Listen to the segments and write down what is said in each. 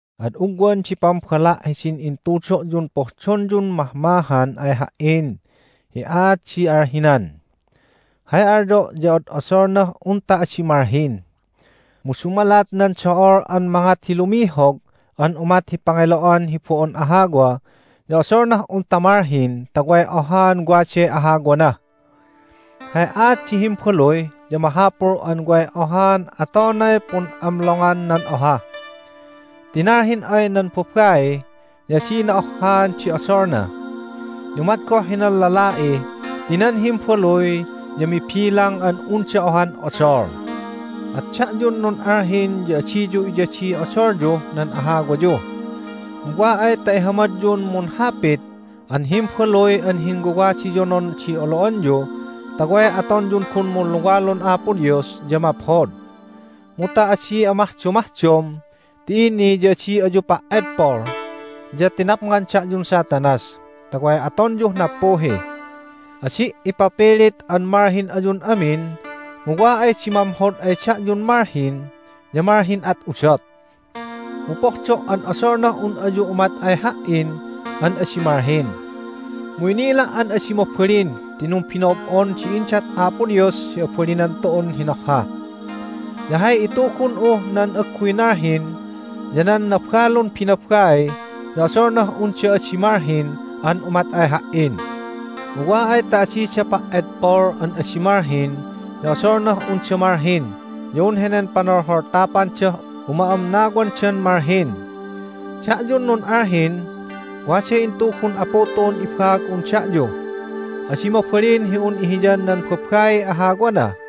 Ad ugwan di pambala' hidin intudo'yun pohdonyun mahmahan ay ha"in hi aat di alhinan. Hay alyo' ya od'odolnah unta adi malhin. Mu dumalat nan do'ol an mangat hi lumihog an umat hi pangelo'an hi bo'on ahawa ya odolnah unta malhin ta way ohaan waday ahawana. Hay aat di himbaluy ya mahapul an way ohaan atonay pun'amlongan nan oha. Ti nalhin ay nan babai ya adina ohhaan di odolna, ya umat goh hinan lala'i ti nan himbaluy ya mibilang an unda ohan odol. At da'yun nun'alhin ya adiyu iyadiy odolyuh nan ahawayu, mu wa ay ta ihamadyun munhapit an himbaluy an hinwawadiyonon di olo'anyu ta way atonyun gun munluwalun Apo Dios ya maphod. Mu ta adi amahdomahdom ti ini ya adi ayu pa"edpol, ya tinapngan da'yun Satanas ta way atonyuh nappuhi. Adi' ipapilit an malhin ayun amin, mu wa ay di mamhod ay da'yun malhin ya malhin at udot. Mu pohdo' an odolnah un ayu umat ay ha"in an adi malhin. Mu inila' an adi mabalin ti numbino'ob'on di indat Apo Dios hi abalinan tu'un hinohha. Ya hay itugun'uh nan agguy nalhin ya nan nabalun binabai ya odolnah unda adi malhin an umat ay ha"in. Mu wa ay ta adida pa"edpol an adi malhin ya odolnah unda malhin ya un henen panolholtapandah uma'amnawandan malhin. Da'yun nun'alhin, waday intugun Apu tu'un ibaag'un da'yu: Adi mabalin hi un ihiyan nan babaiy ahawana.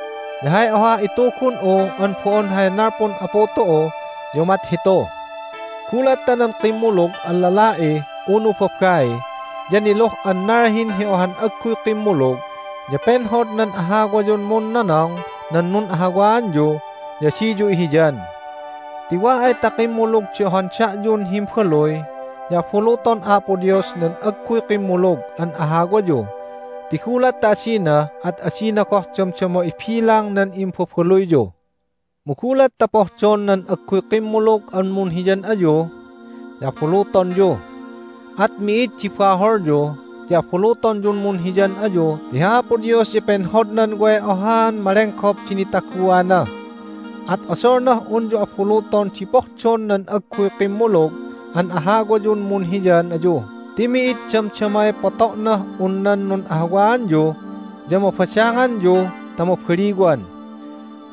Ya hay ohah itugun'u an bo'on hay nalpun Apu tu'u ya umat hitu: Gulat ta nan kimmulug an lala'i unu babai ya niluh an nalhin hi ohan agguy kimmulug ya penhod nan ahawayun munnonong nan nun'ahawaanyu ya adiyu ihiyan. Ti wa ay ta kimmulug di ohan da'yun himbaluy ya abuluton Apo Dios nan agguy kimmulug an ahawayu ti gulat ta adina at adina goh damdama ibilang nan imbabaluyyu. Mu gulat ta pohdon nan agguy kimmulug an munhiyan ayu ya abulutonyu, at mi'id di baholyu ti abulutonyun munhiyan ayu ti hi Apo Dios ya penhodnan way ohaan malenggop di nitaguana. At odolnah unyu abuluton di pohdon nan agguy kimmulug an ahawayun munhiyan ayu ti mi'id damdamay poto'nah un nan nun'ahawaanyu ya mabadanganyu ta mabaliwan.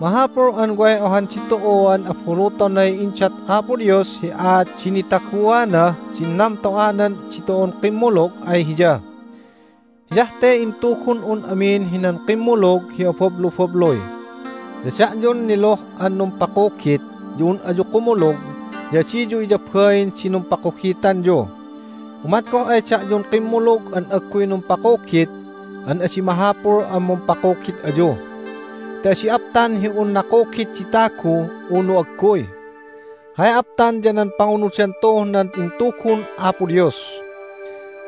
Mahapul an way ohan ditu'uan abulutonay indat Apo Dios hi aat di nitaguanah din namto'anan ditu'un kimmulug ay Hiya. Hiyah te intugun'un amin hinan kimmulug hi abablubabluy. Ya da'yun niluh an numpakugit ya un ayu kumulug ya adiyu iyabain di numpakugitanyu. Umat goh ay da'yun kimmulug an agguy numpakugit an adi mahapul an mumpakugit ayu. Ti adi aptan hi un nakugit di tagu unu agguy. Hay aptan ya nan pangunudan tu'uh nan intugun Apo Dios.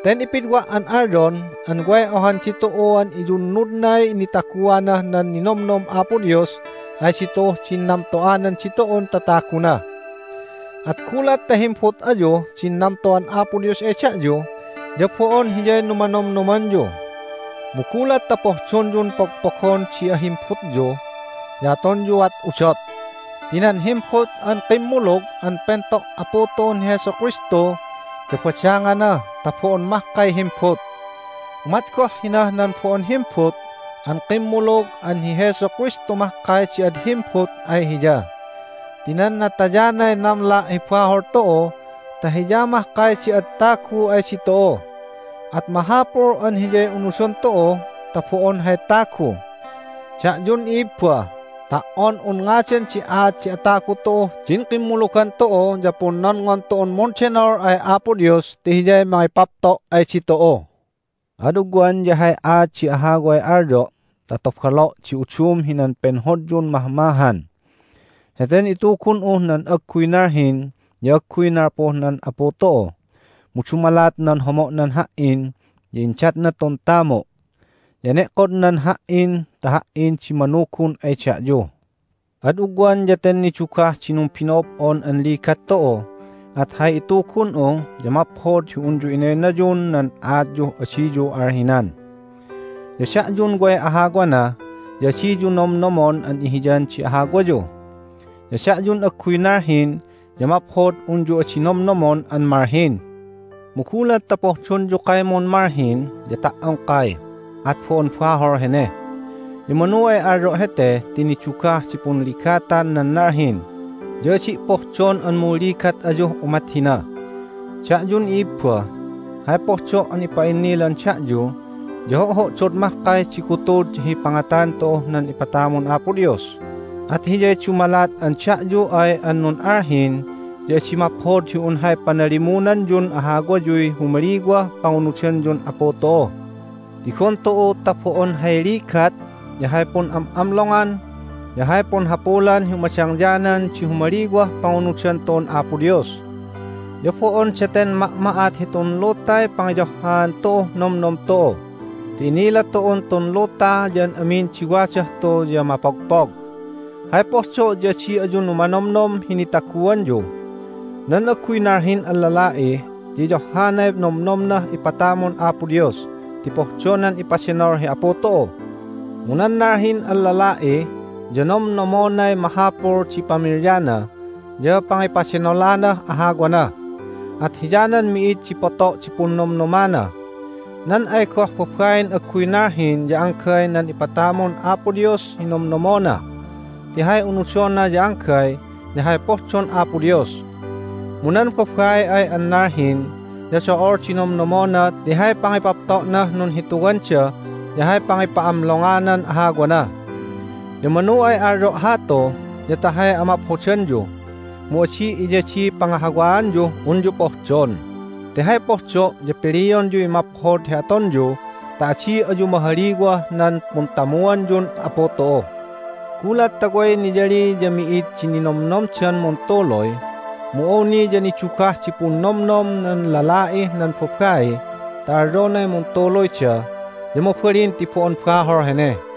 Ten ipidwa' an alyon an way ohan ditu'uan iyunnudnay nitaguanah nan ninomnom Apo Dios ay ditu'uh din namto'anan ditu'un tataguna. At gulat ta himbut ayuh din namto'an Apo Dios ay da'yu ya bo'on hiyay numanomnomanyu. Mu gulat ta pohdonyun pogpogon di ahimbutyu ya atonyuat udot. Ti nan himbut an kimmulug an pento' Apu tu'un hi Jesu Kristu ya badangana ta bo'on mahkay himbut. Umat goh hinah nan bo'on himbut an kimmulug an hi Jesu Kristu mahkay di ad himbut ay hiya. Ti nan natayanay namla' hi bahol tu'u ta Hiya mahkay di ad tagu ay ditu'u, at mahapul an Hiyay unudon tu'u ta bo'on hay tagu. Da'yun i'ibba, ta"on un ngadan di aat di atagu tu'uh din kimmulugan tu'u ya punnonngon tu'un mundenol ay Apo Dios ti Hiyay mangipapto' ay ditu'u. Ad ugwan ya hay aat di ahaway alyo' ta tobalo' di udum hinan penhodyun mahmahan. Heten itugun'uh nan agguy nalhin ya agguy nalpuh nan Apu tu'u, mu dumalat nan homo'nan ha"in ya indatna tun tamu', ya ene'kodnan ha"in ta ha"in di manugun ay da'yu. Ad ugwan ya ten nidugah di numbino'ob'on an ligat tu'u, at hay itugun'u ya maphod hi unyu inaynayun nan aatyuh adiyu alhinan. Ya da'yun way ahawana ya adiyu nomnomon an ihiyan di ahawayu. Ya da'yun agguy nalhin ya maphod unyu adi nomnomon an malhin. Mu gulat ta pohdonyu kaymun malhin ya ta"ongkay, at bo'on bahol hene. Ya manu ay alyo' hete ti nidugah di punligatan nan nalhin, ya adi' pohdon an munligat ayuh umat hina. Da'yun i'ibba, hay pohdo' an ipa'innilan da'yu ya ho'ho'dod mahkay di gutud hi pangatan tu'uh nan ipatamun Apo Dios, at hiyay dumalat an da'yu ay an nun'alhin ya adi maphod hi un hay panalimunanyun ahawayuy humaliwah pangunudanyun Apu tu'u. Tigon tu'u ta bo'on hay ligat, ya hay pun'am'amlongan, ya hay punhapulan hi umadangyanan di humaliwah pangunudan tu'un Apo Dios. Ya bo'on daten ma'ma'at hitun lutay pangiyohhaan tu'uh nomnom tu'u ti inila tu'un tun luta ya an amin di wadah tu ya mapogpog. Hay pohdo' ya adi ayu numanomnom hi nitaguanyu. Nan agguy nalhin an lala'i ya iyohhanay nomnomnah ipatamun Apo Dios ti pohdonan ipadenol hi Apu tu'u. Mu nan nalhin an lala'i ya nomnomnomonay mahapul di pamilyana ya pangipadenolanah ahawana, at hiyanan mi'id di poto' di punnomnomana. Nan ay goh babain agguy nalhin ya anggay nan ipatamun Apo Dios hi nomnomnomona ti hay unudona ya anggay ya hay pohdon Apo Dios. Mu nan babai ay an nalhin ya do'ol di nomnomona ti hay pangipapto'nah nunhituwanda ya hay pangipa'amlonganan ahawana. Ya manu ay alyo' hatu ya ta hay amaphodanyu, mu adi' iyadiy pangahawaanyuh unyu pohdon. Ti hay pohdo' ya pilionyuy maphod hi atonyu ta adi ayu mahaliwah nan puntamuanyun Apu tu'u. Gulat ta way niyali ya mi'id di ninomnomdan muntuluy, mu awni ya nidugah di punnomnom nan lala'ih nan babai ta alyonay muntuluyda ya mabalin ti bo'on bahol hene.